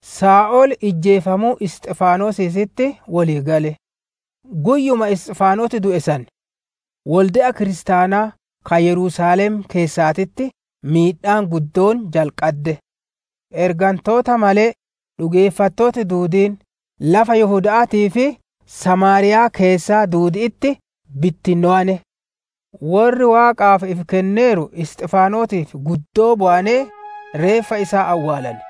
Saa'ol ijjeefamuu Isxifaanosiititti wolii gale; guyyuma Isxifaanos du'e san wolde'a kiristaanaa ka Yerusaalem keessaatitti miidhaan guddoon jalqadde. Ergantoota malee, dhugeeffattooti duudiin lafa Yihuda'aatii fi Samaariyaa keessaa duudi'itti bittinnowane. Worri Waaqaaf ifi kenneeru Isxifaanosiif guddoo bowanee, reeffa isaa awwaalane.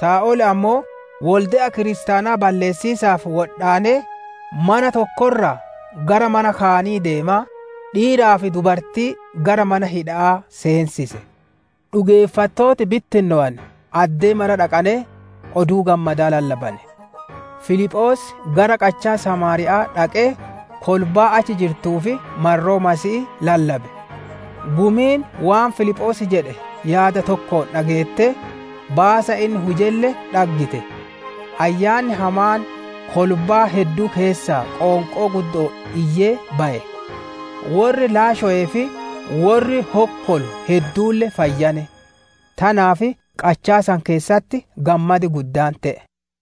Saa'ol ammoo wolde'a kiristaanaa balleessiisaaf wodhaanee, mana tokko irraa gara mana kaanii deemaa, dhiiraa fi dubartii gara mana hidha'aa seensise. Dhugeeffattooti bittinnowane addee mara dhaqanee, Oduu Gammadaa lallabane. Filiphoos gara qachaa Samaariya'aa dhaqee kolbaa achi jirtuuf marroo Masiihii lallabe. Gumiin waan Filiphoos jedhe yaada tokkoon dhageettee, baasa inni hujelle dhaggite. Ayyaanni hamaan kolbaa hedduu keessaa qoonqoo guddo'oon iyyee baye; worri laashowee fi worri hokkolu hedduulle fayyane. Tanaaf qachaa san keessatti gammadi guddaan te'e.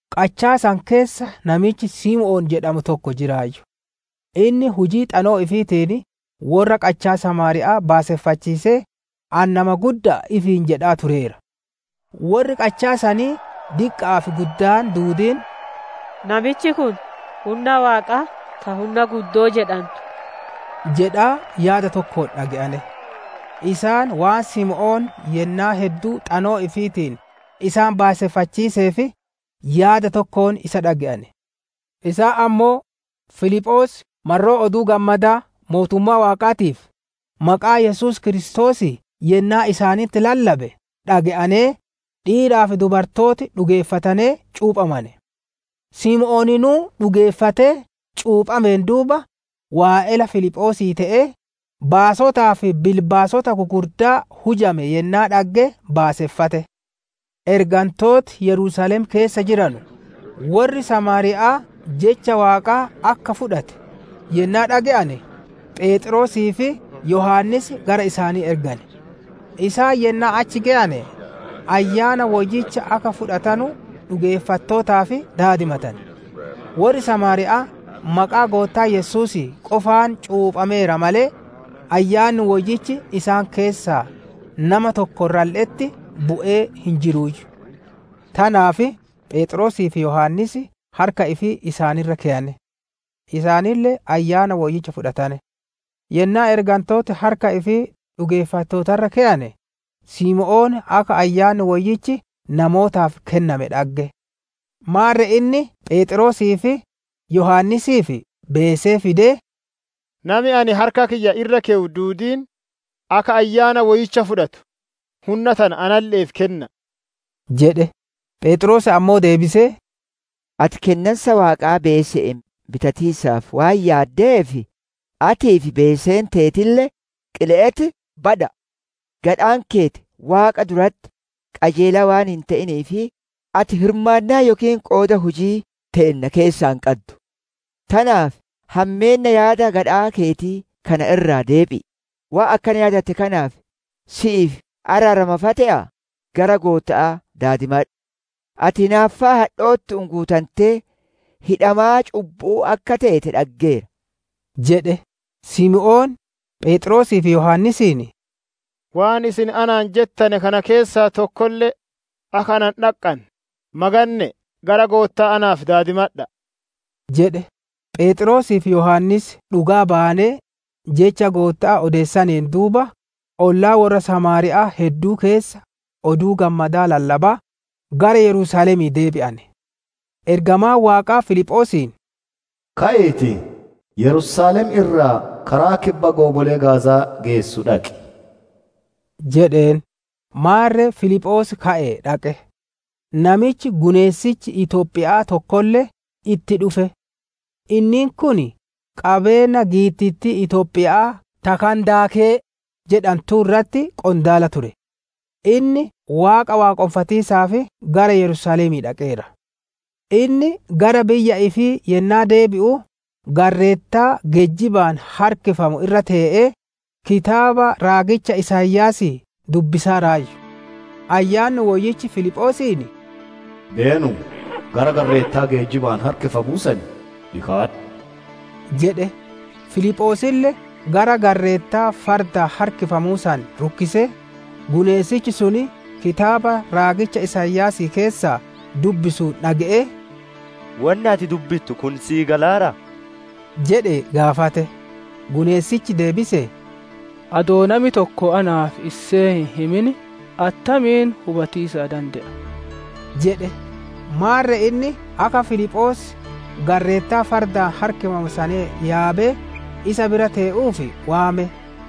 Qachaa san keessa namichi Simoon jedhamu tokko jiraayyu; inni hujii xanoo ifiitiin worra qachaa Samaariya'aa baaseffachiisee, ani nama gudda'a ifiin jedhaa tureera. Worri qachaa sanii diqqa'aa fi guddaan duudiin, «Namichi kun, hunna Waaqaa ta ‹Hunna guddoo› jedhantu» jedhaa yaada tokkoon dhage'ane. Isaan, waan Simoon yennaa hedduu xanoo ifiitiin isaan baaseffachiiseef, yaada tokkoon isa dhage'ane. Isaan ammoo Filiphoos marroo oduu gammada Mootummaa Waaqaatii fi maqaa Yesuus Kiristoosii yennaa isaanitti lallabe dhage'anee, dhiiraa fi dubartooti dhugeeffatanee cuuphamane. Simooninuu dhugeeffatee cuuphameen duuba, waa'ela Filiphoosii te'ee, baasotaa fi bilbaasota gugurdaa hujame yennaa dhagge baaseffate. Ergantooti Yerusaalem keessa jiranu, worri Samaariya'aa Jecha Waaqaa akka fudhate yennaa dhage'ane, Pheexroosii fi Yohaannis gara isaanii ergane. Isaan yennaa achi geyane, Ayyaana Woyyicha akka fudhatanu dhugeeffattootaaf daadimatane. Worri Samaariya'aa maqaa Goottaa Yesuusii qofaan cuuphameera malee, Ayyaanni Woyyichi isaan keessaa nama tokko irralle'etti bu'ee hin jiruuyyu. Tanaaf Pheexroosii fi Yohaannis harka ifii isaan irra keyane; isaanille Ayyaana Woyyicha fudhatane. Yennaa ergantooti harka ifii dhugeeffattoota irra keyane, Simoon akka Ayyaanni Woyyichi namootaaf kenname dhagge. Maarre inni Pheexroosii fi Yohaannisiif beesee fidee, «Nami ani harka kiyya irra keyu duudiin, akka Ayyaana Woyyicha fudhatu hunna tana analle'eef kenna'a» jedhe. Pheexroos ammoo deebisee, «Ati Kennansa Waaqaa beese'een bitatiisaaf waan yaaddeef, atii fi beeseen teetille qile'etti bada'a! Gadhaan keeti Waaqa duratti qajeelaa waan hin te'iniif, ati hirmaannaa yookiin qooda hujii teenna keessaa hin qaddu. Tanaaf hammeenna yaada gadhaa keetii kana irraa deebi'i; waan akkana yaadatte kanaaf si'iif araarama fa'a te'a, gara Gootta'aa daadimadhu. Ati hinaaffaa hadhoottu'uun guutantee, hidhamaa cubbu'uu akka teete dhaggeera» jedhe. Simoon, Pheexroosii fi Yohaannisiin, «Waan isin anaan jettane kana keessaa tokkolle akka ana hin dhaqqanne, maganne'ee gara Gootta'aa naaf daadimadha'a» jedhe. Pheexroosii fi Yohaannis dhugaa bayanee, Jecha Gootta'aa odeessaneen duuba, ollaa worra Samaariya'aa hedduu keessa Oduu Gammadaa lallabaa gara Yerusaalemii deebi'ane. Ergamaan Waaqaa Filiphoosiin, «Ka'iitii, Yerusaalem irraa karaa kibba goomolee Gaaza'aa geessu dhaqi» jedheen. Maarre Filiphoos ka'ee dhaqe; namichi guneessichi Itoophiya'aa tokkolle itti dhufe; inniin kun qabeenna giittittii Itoophiya'aa ta «Kandaakee» jedhantuu irratti qondaala ture; inni Waaqa waaqonfatiisaaf gara Yerusaalemii dhaqeera. Inni gara biyya ifii yennaa deebi'u garreettaa geejjibaan harkifamu irra tee'ee, kitaaba raagicha Isaayaasii dubbisaaraayyu. Ayyaanni Woyyichi Filiphoosiin, «Beenu gara garreettaa geejjibaan harkifamu sanii dhikaadhu» jedhe. Filiphoosille gara garreettaa fardaan harkifamuu san rukkisee, guneessichi sun kitaaba raagicha Isaayaasii keessaa dubbisuun dhage'ee, «Wonni ati dubbittu kun sii galaaraa?» jedhee gaafate. Guneessichi deebisee, «Adoo nami tokko naaf issee hin himin attamiin hubatiisa dande'a?» jedhe. Maarre inni akka Filiphoos garreettaa fardaan harkifamu san yaabee isa bira tee'uuf waame.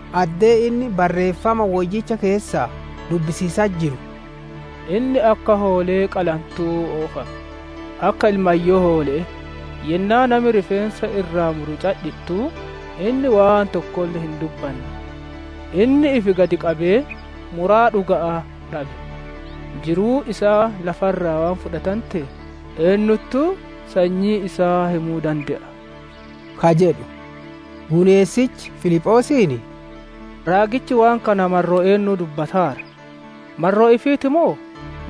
Addeen inni Barreeffama Woyyicha keessaa dubbisiisatti jiru, «Inni akka hoolee qalantuu oofame; akka ilmayyoo hoole'ee, yennaa nami rifeensa irraa muru cadhittuu, Inni waan tokkolle hin dubbanne. Inni ifi gad qabee, muraa dhuga'aa dhabe. Jiruun isaa lafa irraa waan fudhatanteef, eennuttuu sanyii isaa himuu dande'a?» ka jedhu. Guneessichi Filiphoosiin, «Raagichi waan kana marroo eennuu dubbataara? Marroo ifiiti moo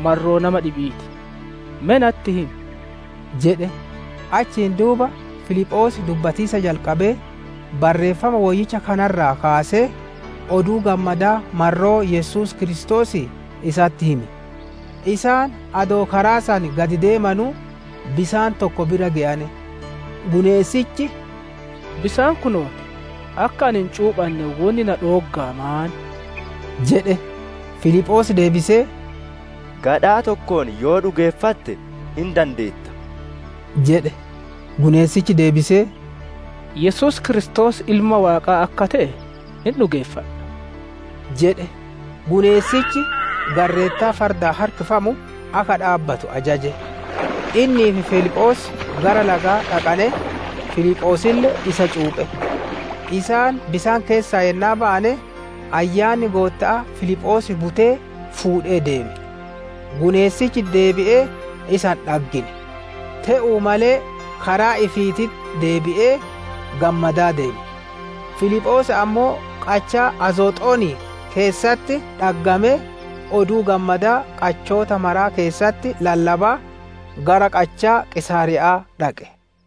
marroo nama dhibi'ii ti? Me natti himi» jedhe. Achiin duuba Filiphoos dubbatiisa jalqabee, Barreeffama Woyyicha kana irraa kaasee, Oduu Gammadaa marroo Yesuus Kiristoosii isatti hime. Isaan adoo karaa san gad deemanuu, bisaan tokko bira geyane. Guneessichi, «Bisaan kunoo ti; akka ani hin cuuphanne wonni na dhooggaa maan?» jedhe. [ Filiphoos deebisee, «Gadhaa tokkoon yoo dhugeeffatte hin dandeetta» jedhe. Guneessichi deebisee, «Yesuus Kiristoos Ilma Waaqaa akka te'e hin dhugeeffadha» jedhe.] Guneessichi garreettaa fardaan harkifamu akka dhaabbatu ajaje; innii fi Filiphoos gara lagaa dhaqanee, Filiphoosille isa cuuphe. Isaan bisaan keessaa yennaa bayane, Ayyaanni Gootta'aa Filiphoos butee fuudhee deeme. Guneessichi deebi'ee isa hin dhaggine. Teetuu malee karaa ifiititti deebi'ee, gammadaa deeme. Filiphoos ammoo qachaa Azooxonii keessatti dhaggamee, Oduu Gammadaa qachoota maraa keessatti lallabaa, gara qachaa Qiisaariya'aa dhaqe.